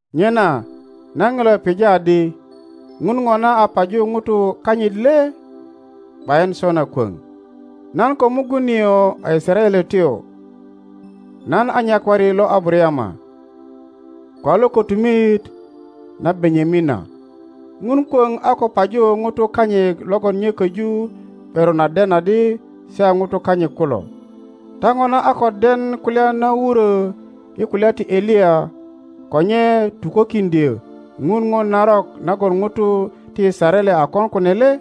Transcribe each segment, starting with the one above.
Nyena nan ŋilo pija adi, Ŋun ŋona a paju ŋutu kanyit le? ’Bayin sona kwöŋ! Nan ko mugun nio a Yisaraeletyo, nan a nyakwari lo Abarayama, ko a lo kötumit na Benyamina. Ŋun kwöŋ a ko paju ŋutu kanyit logon nye köju ’beron a den adi se a ŋutu kanyit kulo. Ta ŋona a ko den kulya na wurö i kulya ti Eliya ko nye tukokiŋdyö Ŋun ŋo narok nagon ŋutu ti Yisaraele a kon kunu le?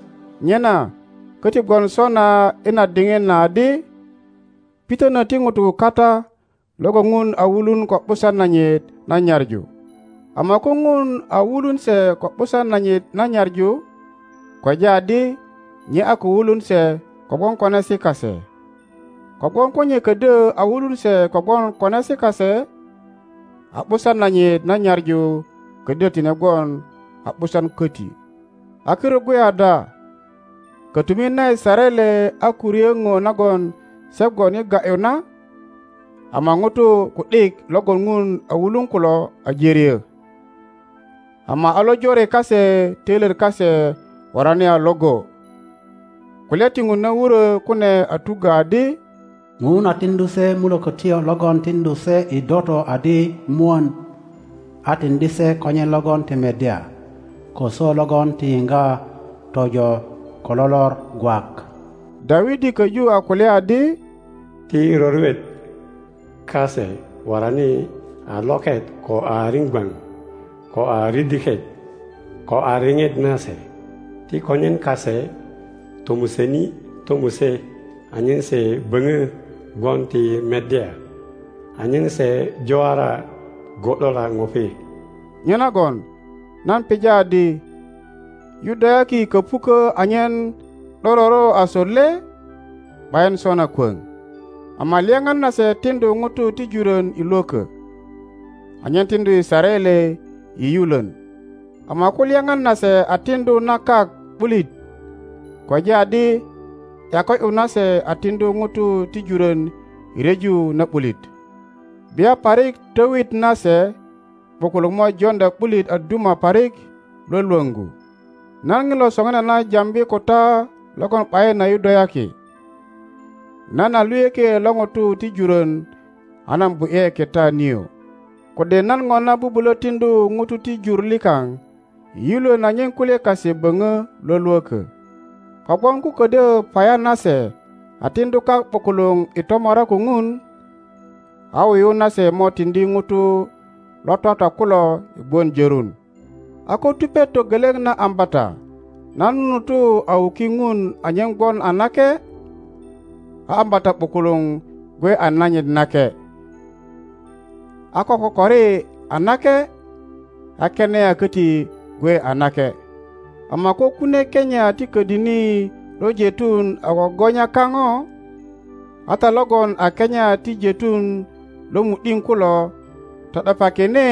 Nyena köti gwon sona i na diŋit na adi, pitönö ti ŋutu kata logon Ŋun a wulunko ’busan nanyit na nyaŋu. Ama ko Ŋun a wulun se ko ’busan nanyit na nyaŋu, kweja adi nye a ko wulun se kogwon konesi kase; kogwon ko nye ködyö a wulun se kogwon konesi kase, a ’busan nanyit na nyaŋu ködyö tine gwon a ’busan köti. A kirut gwe ada? Kötumit na Yisaraele a ko ryö ŋo nagon se gwon i ga ’yu na, ama ŋutu ku ’dik logon Ŋun a wulun kulo aje ryö, ama a lojore kase töilyet kase worani a Iŋgo. Kulya ti Ŋun na wurö kune a tuggö adi, Ŋun a tiŋdu se mulökötyo logon tiŋdu se i doto adi mwön, a tiŋdi se konyen logon ti meddya, ko swö logon ti yiŋga tojo ko lo lor gwak. Dawidi köju a kulya adi, Ti roriot kase worani a loket ko a riŋgwaŋ, ko a ridiket ko a riŋet nase. Ti konyen kase tomuseni tomuse anyen se böŋö gwon ti meddya, anyen se juwara gu ’dula ŋupi. Nyenagon nan pija adi, Yudayaki köpukö anyen ’dororo asut le? ’Bayin sona kwöŋ! Ama lyaŋan nase tiŋdu ŋutu ti jurön i lwökö, anyen tiŋdu Yisaraele i yulön. Ama ko lyaŋan nase a tiŋdu na kak ’bulit, kweja adi ’yako ’yu nase a tiŋdu ŋutu ti jurön i ryeju na ’bulit, bia parik twöyit nase ’bukuluŋ mo joŋdya ’bulit a duma parik lwölwöŋgu. Nan ŋilo soŋinana jambi ko ta logon ’bayin a Yudayaki. Nan a luyökielo ŋutu ti jurön a nan bu ’ye kita nio, kode nan ŋona bubulö tiŋdu ŋutu ti jur likaŋ i yulön anyen kulye kase böŋö lwölwökö. Kogwon ko ködyö paya nase a tiŋdu kak ’bukuluŋ i tomora ko Ŋun, a wuyu nase mo tiŋdi ŋutu lo twatwa kulo i gwon jörun! A ko tupet togeleŋ na ambata na nunutu a wuki Ŋun anyen gwon a nake, a ambata ’bukuluŋ gwe a nanyit nake. A ko kokori a nake a kenia köti gwe a nake. Ama ko kunie kenia ti ködini lo jeitun a gogonya kaŋo, a ta logon a kenia ti jeitun lo mu ’diŋ kulo to ’depakine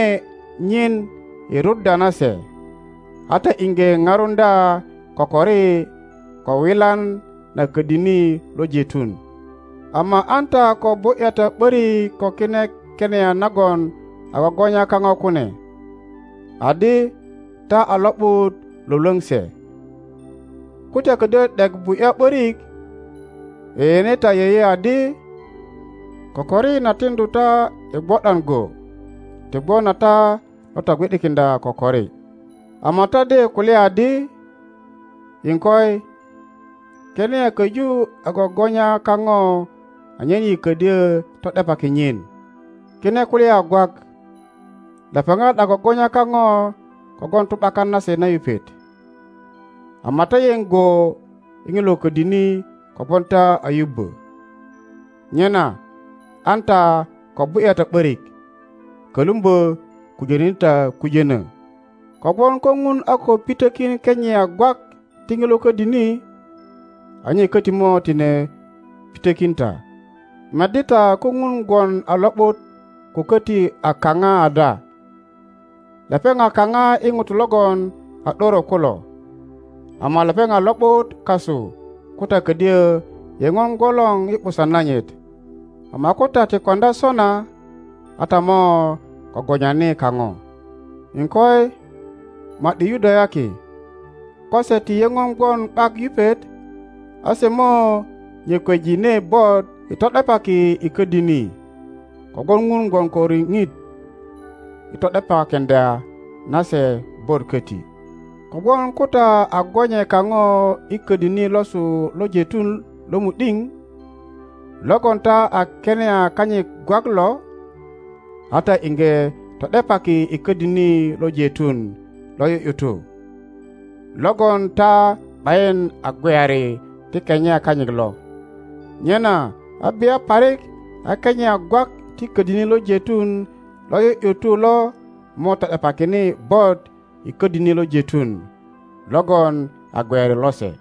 nyin i ruddya na se, a ta iŋge ŋarundya kokori ko wilan na ködini lo jeitun. Ama an ta ko bu ’ya ta ’börik ko kine kenia nagon a gogonya kaŋo kune, adi ta a lo ’but lwölwöŋ se. Ko ta ködyö ’dek bu ’ya ’börik, yeyene ta yeye adi kokori na tiŋdu ta i gwo ’dan go, ti gwon a ta lo togwi ’dikiŋdya kokori. Ama ta de kulya adi, Iŋkoi, kenia köju a gogonya kaŋo anyen yi ködyö to ’depaki nyin. Kine kulya a gwak. Lepeŋat a gogonya kaŋo kogwon tu ’bakan nase na yupet, ama ta yeŋ go i ŋilo ködini kogwon ta a yubbö. Nyena an ta ko bu ’ya ta ’börik, kölumbö kujönöni ta kujönö. Kogwon ko Ŋun a ko pitökin kenia gwak ti ŋilo ködini, a nye köti mo tine pitökin ta. Meddi ta ko Ŋun gwon a lo ’but ko köti a kaŋa ada; lepeŋ a kaŋa i ŋutu logon a ’doro kulo, ama lepeŋ a lo ’but kasu ko ta ködyö yeŋon gwolor i ’busan nanyit. Ama ko ta ti koŋdya sona, a ta mo gogonyani kaŋo. iŋkoi, ma ’di Yudayaki, ko se ti yeŋon gwon ’bak yupet, a se mo nyököjine bot i to ’depaki i ködini, kogwon Ŋun gwon ko riŋit i to ’depakiŋdya na se bot köti. Kogwon ko ta a gonywe kaŋo i ködini losu lo jeitun lo mu ’diŋ, logon ta a kenia kanyit gwak lo, a ta iŋge to ’depaki i ködini lo jeitun lo ’yu ’yutu, logon ta ’bayin a gweyari ti kenia kanyit lo, nyena a bia parik a kenia gwak ti ködini lo jeitun lo ’yu ’yutu lo mo to ’depakine bot i ködini lo jeitun logon a gweyari lose.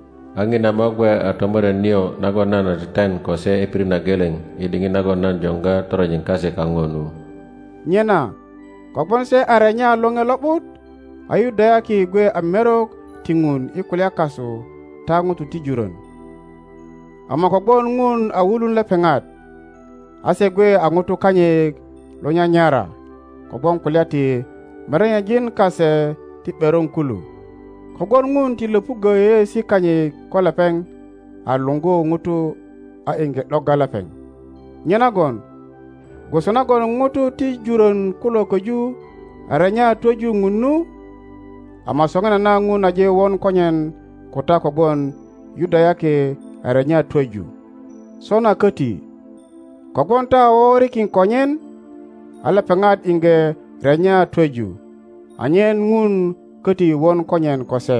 A ŋina mo gwe a tomoret nio nagon nan a teten ko se i pirit na geleŋ i diŋit nagon nan joŋga toronjin kase kaŋo nu. Nyena kogwon se a renya Loŋe Lo ’but a Yudayaki gwe a merok ti Ŋun i kulya kasu ta ŋutu ti jurön, ama kogwon Ŋun a wulun lepeŋat, a se gwe a ŋutu kanyit lo nyanyara kogwon kulya ti merenyejin kase ti ’beron kulu. Kogwon Ŋun ti löpuggö yeyeesi kanyit ko lepeŋ a luŋgu ŋuto a iŋge ’dogga lepeŋ. Nyenagon gwoso nagon ŋutu ti jurön kulo köju a renya twöju Ŋun nu, ama soŋinana Ŋun aje won konyen ko ta kogwon Yudayaki a renya twöju. Sona köti, kogwon ta a woŋorikin konyen, a lepeŋat iŋge renya twöju, anyen Ŋun köti won konyen ko se.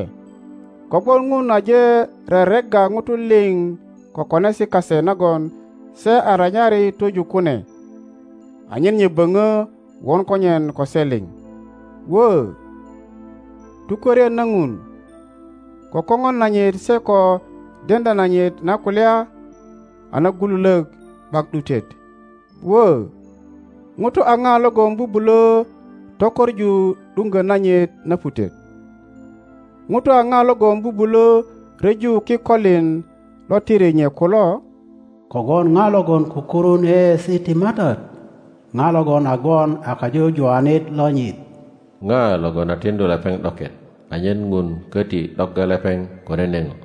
Kogwon Ŋun aje reregga ŋutu liŋ ko konesi kase nagon se a renyari twöju kune, anyen nye böŋö won konyen ko se liŋ. Wö, tukwörien na Ŋun, ko koŋon nanyit se ko deŋdya nanyit na kulya a nagululök ’bak ’dutet! Wö, ŋuto a ŋa logon bubulö tokoŋu ’duŋgö nanyit na putet? Ŋuto a ŋa logon bubulö ryeju kikolin lo tiri nye kulo? Kogwon ŋa logon kukurun yeyeesi ti Matat? Ŋa logon a gwon a kajujuwanit lonyit? Ŋa logon a tiŋdu lepeŋ ’doket, anyen Ŋun köti ’dogga lepeŋ ko nene ŋo?